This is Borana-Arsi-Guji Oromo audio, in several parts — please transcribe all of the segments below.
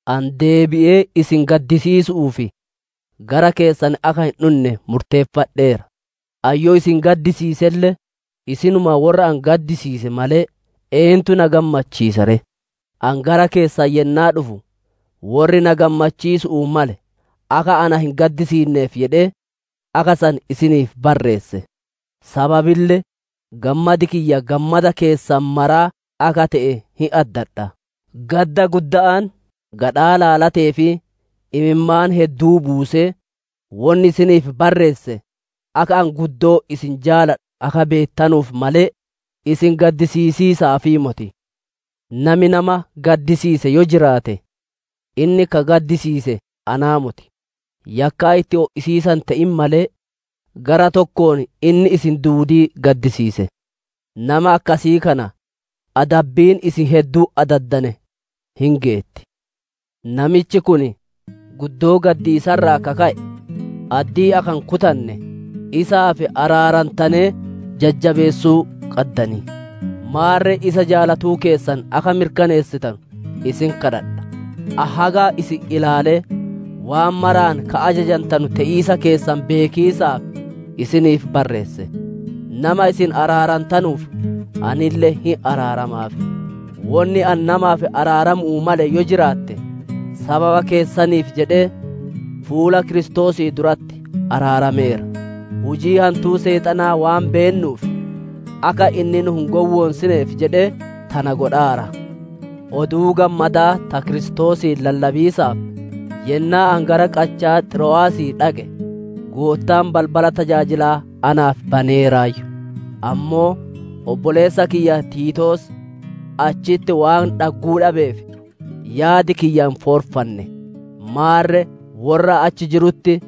Ani deebi'ee isin gaddisiisu'uuf gara keessan akka hin dhunne murteeffadheera. Ani yoo isin gaddisiiselle, isinuma worra ani gaddisiise malee, eentu na gammachiisa ree? Ani gara keessan yennaa dhufu, worri na gammachiisu'uu male akka na hin gaddisiinneef jedhee, akka san isiniif barreesse. Sababille gammadi kiyya gammada keessan maraa akka te'e hin addadha. Gadda gudda'aan, gadhaa laalatee fi imimmaan hedduu buusee wonni isiniif barreesse, akka ani guddoo isin jaaladhu akka beettanuuf malee, isin gaddisiisiisaafii moti. Nami nama gaddisiise yoo jiraate inni ka gaddisiise anaa moti; yakkaa itti o'isiisa hin te'in malee, gara tokkoon inni isin duudii gaddisiise. Nama akkasii kana, adabbiin isin hedduun adaddane hin geetti. Namichi kun guddoo gaddiisa irraa ka ka'e addii akka hin kutanne, isaaf araarantanee jajjabeessuu qaddan. Maarre isa jaalatuu keessan akka mirkaneessitanu isin kadhadha. Ani haga isin ilaalee, waan maraan ka ajajantanu te'iisa keessan beekiisaaf isiniif barreesse. Nama isin araarantanuuf, anille hin araaramaaf. Wonni ani namaaf araaramu'uu male yoo jiraatte, sababa keessaniif jedhee fuula Kiristoosii duratti araarameera. Hujii hantuu seexanaa waan beennuuf, akka inni nu hin gowwoonsineef jedhee tana godhaara. Oduu Gammadaa ta Kiristoosii lallabiisaaf, yennaa ani gara qachaa Xiro'aasii dhaqe, Goottaan balbala tajaajilaa naaf baneeraayyu. Ammoo obboleessa kiyya Tiitoos achitti waan dhagguu dhabeef, yaadi kiyya hin foorfanne. Maarre worra achi jirutti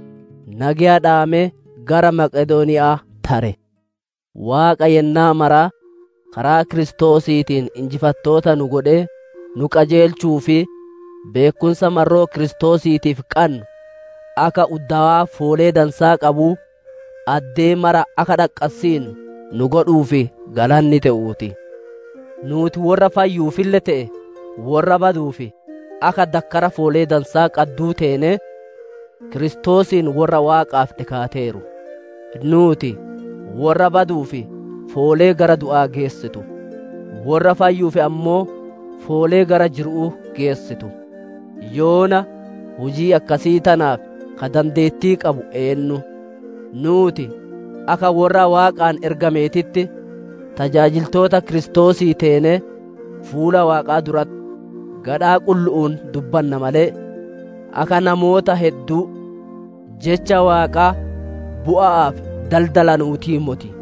nageya dhaamee gara Maqedooniya'aa tare. Waaqa yennaa mara karaa Kiristoosiitiin injifattoota nu godhee, nu qajeelchuu fi beekkumsa marroo Kiristoosiitiif qannu akka uddowaa foolee dansaa qabuu, addee mara akka dhaqqassinnu nu godhuuf galanni te'uu ti. Nuuti worra fayyuufille te'e, worra baduuf akka dakkara foolee dansaa qadduu teenee, Kiristoosiin worra Waaqaaf dhikaateeru. Nuuti, worra baduuf foolee gara du'aa geessitu; worra fayyuuf ammoo foolee gara jiru'uu geessitu. Yoona hujii akkasii tanaaf ka dandeettii qabu eennu? Nuuti akka worra Waaqaan ergameetitti tajaajiltoota Kiristoosii teenee, fuula Waaqaa duratti gadhaa qullu'uun dubbanna malee, akka namoota hedduu Jecha Waaqaa bu'a'aaf daldalanuutii moti.